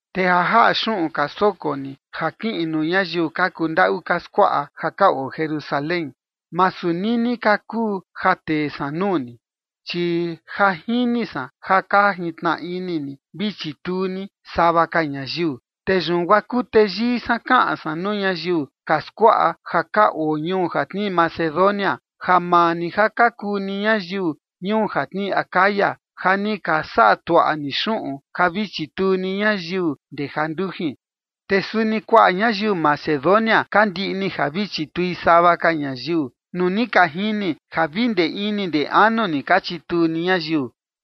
Te ja jaꞌa xuꞌun ka soko ni ja kiꞌin nuu ñayiu ka kundaꞌu ka skuaꞌa ja ka oo Jerusalén, masu nini ka kuu ja tee san nuu ni. Chi ja jini san ja ka jintnaꞌa ini ni vi chituu ni sava ka ñayiu. Te yun guaa kuteyii san kaꞌan san nuu ñayiu ka skuaꞌa ja ka oo ñuu ja tnii Macedonia ja maa ni ja ka kuu ni ñayiu ñuu ja tnii Acaya ja ni ka saꞌa tuaꞌa ni xuꞌun ja vi chituu ni ñayiu ndee jandujin. Te suni kuaꞌa ñayiu Macedonia ka ndiꞌni ja vi chitui sava ka ñayiu nuu ni ka jini ja vi ndee ini ndee anu ni ka chituu ni ñayiu.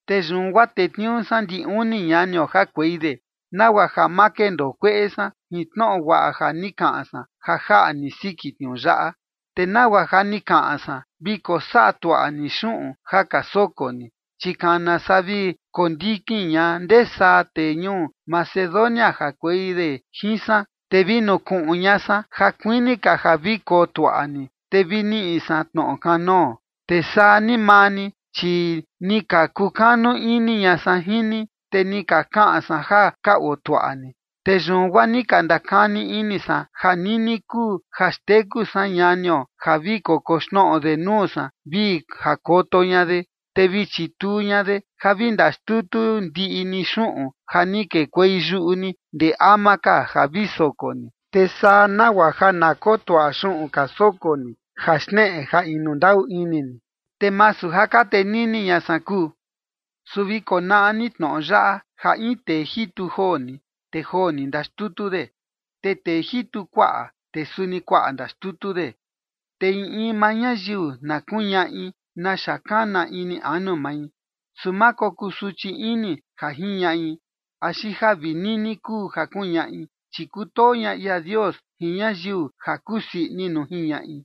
Te yun guaa tetniuu san ndi uni ñanio jakuei de, nagua ja ma kendoo kueꞌe san jin tnoꞌo guaꞌa ja ni kaꞌan san ja jaꞌa ni siki tniuu yaꞌa, te nagua ja ni kaꞌan san vi kosaꞌa tuaꞌa ni xuꞌun ja ka soko ni. Chi kana saa vi kondikin ña ndesaa tee ñuu Macedonia jakuei de jin san, te vi nukuꞌun ña san ja kuini ka ja vi kotuaꞌa ni, te vi niꞌi san tnoꞌo kanoo, te saa ni maa ni, chi ni ka kukanu ini ña san jin ni, te ni ka kaꞌan san ja ka otuaꞌa ni. Te yun guaa ni ndakani ini san ja nini kuu ja xteku san ñanio ja vi kokoxnoꞌo de nuu san vi jakoto ña de, te vi chituu ña de ja vi ndaxtutu ndiꞌi ni xuꞌun ja ni kekuei yuꞌu ni ndee ama ka ja vi soko ni. Te saa nagua ja na kotuaꞌa xuꞌun ka soko ni ja xneꞌe ja inu ndaꞌu ini ni, te masu ja ka tenini ña san kuu. Su vi konaꞌa ni tnoꞌo yaꞌa: Ja in tee jitu joo ni, te joo ni ndaxtutu de, te tee jitu kuaꞌa, te suni kuaꞌa ndaxtutu de. Te in in maa ñayiu na kuñaꞌi naxa kana ini anu mai, su ma kokuu suchi ini ja jiñaꞌi, axi ja vi nini kuu ja kuñaꞌi, chi kutoo ña ia Dios jin ñayiu ja kusii ini nuu jiñaꞌi.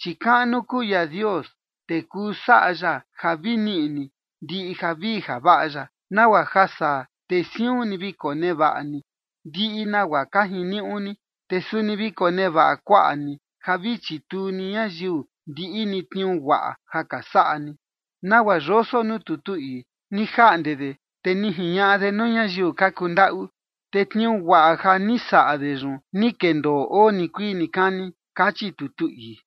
Chi kaꞌnu kuu ia Dios, te kuu saꞌa ya ja vi niꞌi ni ndiꞌi javii javaꞌa ya, nagua ja saa te siun ni vi konevaꞌa ni ndiꞌi nagua ka jiniuꞌu ni, te suni vi konevaꞌa kuaꞌa ni ja vi chituu ni ñayiu ndiꞌi ni tniuu guaꞌa ja ka saꞌa ni, nagua yoso nuu tutu ii: Ni jaꞌnde de te ni jiñaꞌa de nuu ñayiu ka kundaꞌu, te tniuu guaꞌa ja ni saꞌa de yun ni kendoo oo nikuii nikani, kachi tutu ii.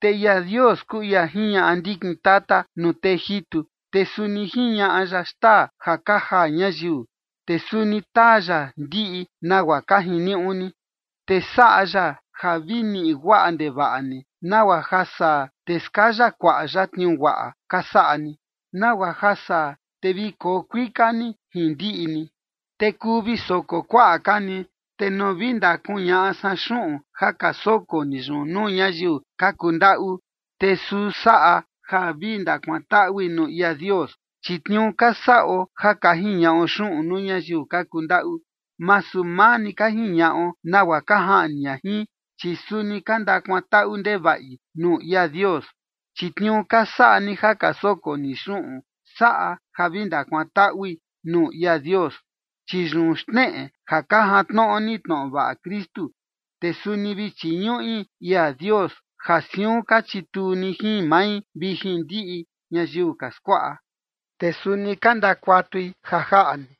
Te ia Dios kuu ia jiñaꞌa ndikin tata nuu tee jitu, te suni jiñaꞌa ya xtaa ja ka jaa ñayiu, te suni taa ya ndiꞌi nagua ka jiniuꞌu ni, te saꞌa ya ja vi niꞌi guaꞌa ndevaꞌa ni, nagua ja saa te skaya kuaꞌa ya tniuu guaꞌa ka saꞌa ni, nagua ja saa te vi koo kuika ni jin ndiꞌi ni, te kuu vi soko kuaꞌa ka ni. Te nuu vi ndakuñaꞌa san xuꞌun ja ka soko ni yun nuu ñayiu ka kundaꞌu, te suu saꞌa ja vi ndakuantaꞌui nuu ia Dios. Chi tniuu ka saꞌo ja ka jiñaꞌo xuꞌun nuu ñayiu ka kundaꞌu, masu maa ni ka jiñaꞌo nagua ka jaꞌni ña jin, chi suni ka ndakuantaꞌu ndevaꞌi nuu ia Dios. Chi tniuu ka saꞌa ni ja ka soko ni xuꞌun saꞌa ja vi ndakuantaꞌui nuu ia Dios, chi yun xneꞌe ja ka jantnoꞌo ni tnoꞌo vaꞌa Kristu. Te suni vi chiñuꞌi ia Dios, ja siun ka chituu ni jin mai vi jin ndiꞌi ñayiu ka skuaꞌa. Te suni ka ndakuatui ja jaꞌa ni,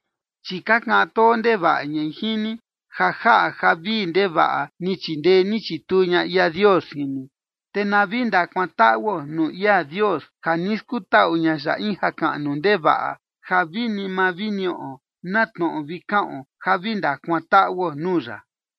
chi ka kaꞌan too ndevaꞌa ñai jin ni, ja jaꞌa ja vii ndevaꞌa ni chindee ni chituu ña ia Dios jin ni. Te na vi ndakuantaꞌuo nuu ia Dios ja ni skutaꞌu ña ya in jakaꞌnu ndevaꞌa ja vini ma vi niꞌo na tnoꞌo vi kaꞌon ja vi ndakuantaꞌuo nuu ya.